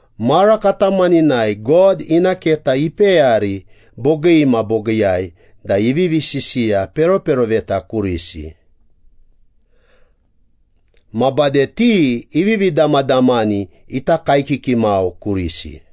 Mara katamaninai God ina keta ipeyari bogii ma bogiiyai da ivivi sisiya peroperoveta kurisi. Ma bade ti ivivi damadamani ita kaekiki mau kurisi.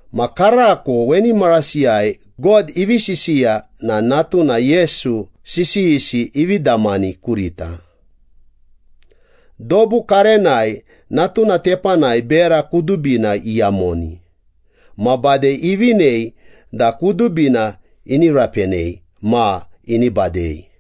Ma karako weni marasiyai God ivi sisiya na Natuna Yesu sisiyisi ivi damani kurita. Dobu karenai Natuna tepanai bera kudubina iyamoni, ma bade ivinei da kudubina ini rapenei ma ini badei.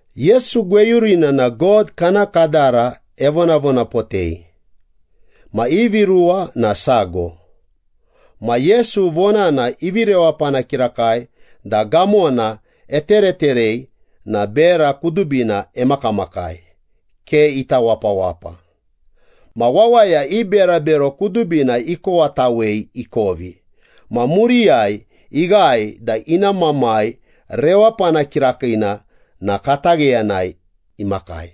Yesu gweyurina na God kana kadara evonavonapotei, ma ivi ruwa na sago. Ma Yesu vonana ivi rewapana kirakai da gamona etereterei na bera kudubina emakamakai, ke ita wapawapa. Ma wawaya i berabero kudubina ikowatawei ikovi, ma muriyai ighae da ina Mamai rewapana kirakiina na katagheyanai imakai.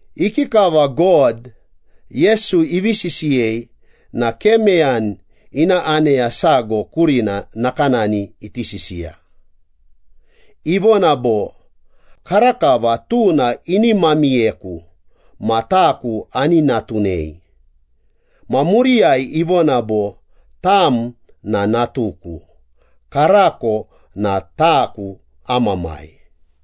Ikikava God, Yesu ivi sisiyei na ke meyani ina aneya sago kurina nakanani iti sisiya. Ivona bo, “Karakava Tuna ini mamiyeku, ma taku ani natunei.” ma muriyai ivona bo, “Tam na natuku, karako na taku am Mamai.”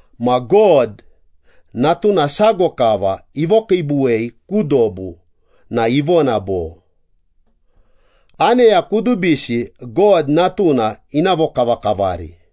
Ma God, Natuna sago kava ivokiibuwei ku dobu na ivona bo, “Aneya kudubisi God Natuna ina vokavakavari.”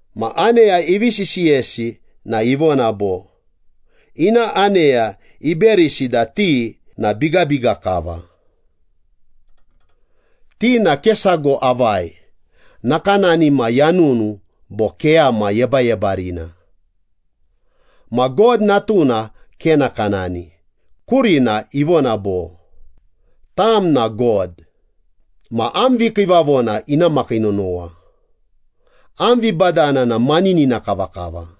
Ma aneya ivi sisiyesi na ivona bo, “Ina aneya iberisi da ti na bigabiga kava. Ti na ke sago avai, nakanani ma yanunu bo keyama yebayebarina.” Ma God Natuna ke nakanani, kurina ivona bo, “Tam na God, ma am vikiivavona ina makii nonowa! Am vibadana na maninina kavakava.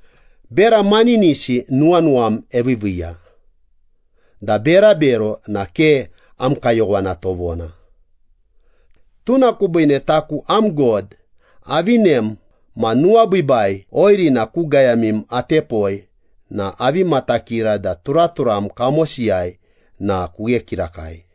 Bera maninisi nuwanuwam eviiviiya, da berabero na ke am kayowana tovona. Tuna kubiine Taku am God avinem ma nuwabiibai oirina ku gayamim atepoi na avi matakira da turaturam kamosiyai na kughe kirakai.”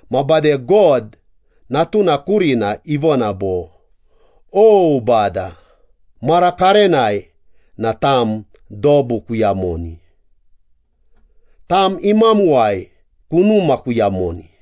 Ma bade God, Natuna kurina ivona bo, “O Bada, mara karenai na Tam dobu kuyamoni, Tam imamuwai kunuma kuyamoni.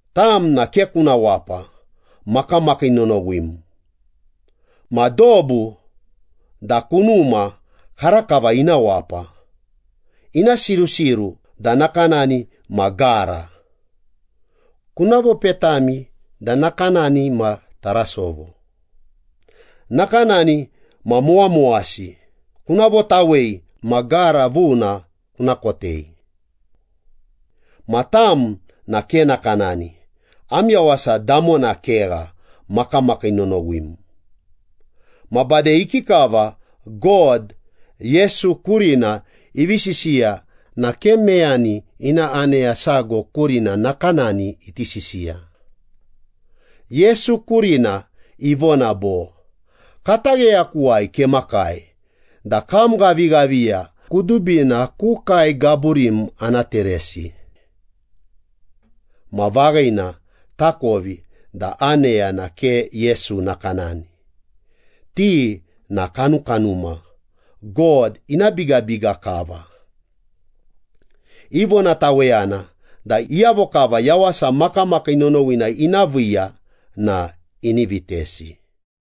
Tam na ke kuna wapa, makamakii nonowim. Ma dobu da kunuma karakava ina wapa, ina sirusiru da nakanani ma gara, Kuna vopetami da nakanani ma tarasovo, nakanani ma mowamowasi kuna votawei ma gara vuna kuna kotei. Ma Tam na ke nakanani, am yawasa damona kegha. Makamakii nonowim.” Ma bade ikikava God, Yesu kurina ivi sisiya na ke meyani ina aneya sago kurina nakanani iti sisiya. Yesu kurina ivona bo, “Katagheyakuwai kemakai da kam ghavighaviya kudubina ku kae gaburim ana teresi.” Ma vaghina, takovi da aneya na ke Yesu nakanani. Ti na kanukanuma, God ina bigabiga kava. Ivonataweyana da iyavo kava yawasa makamakii nonowina ina viiya na ini vitesi.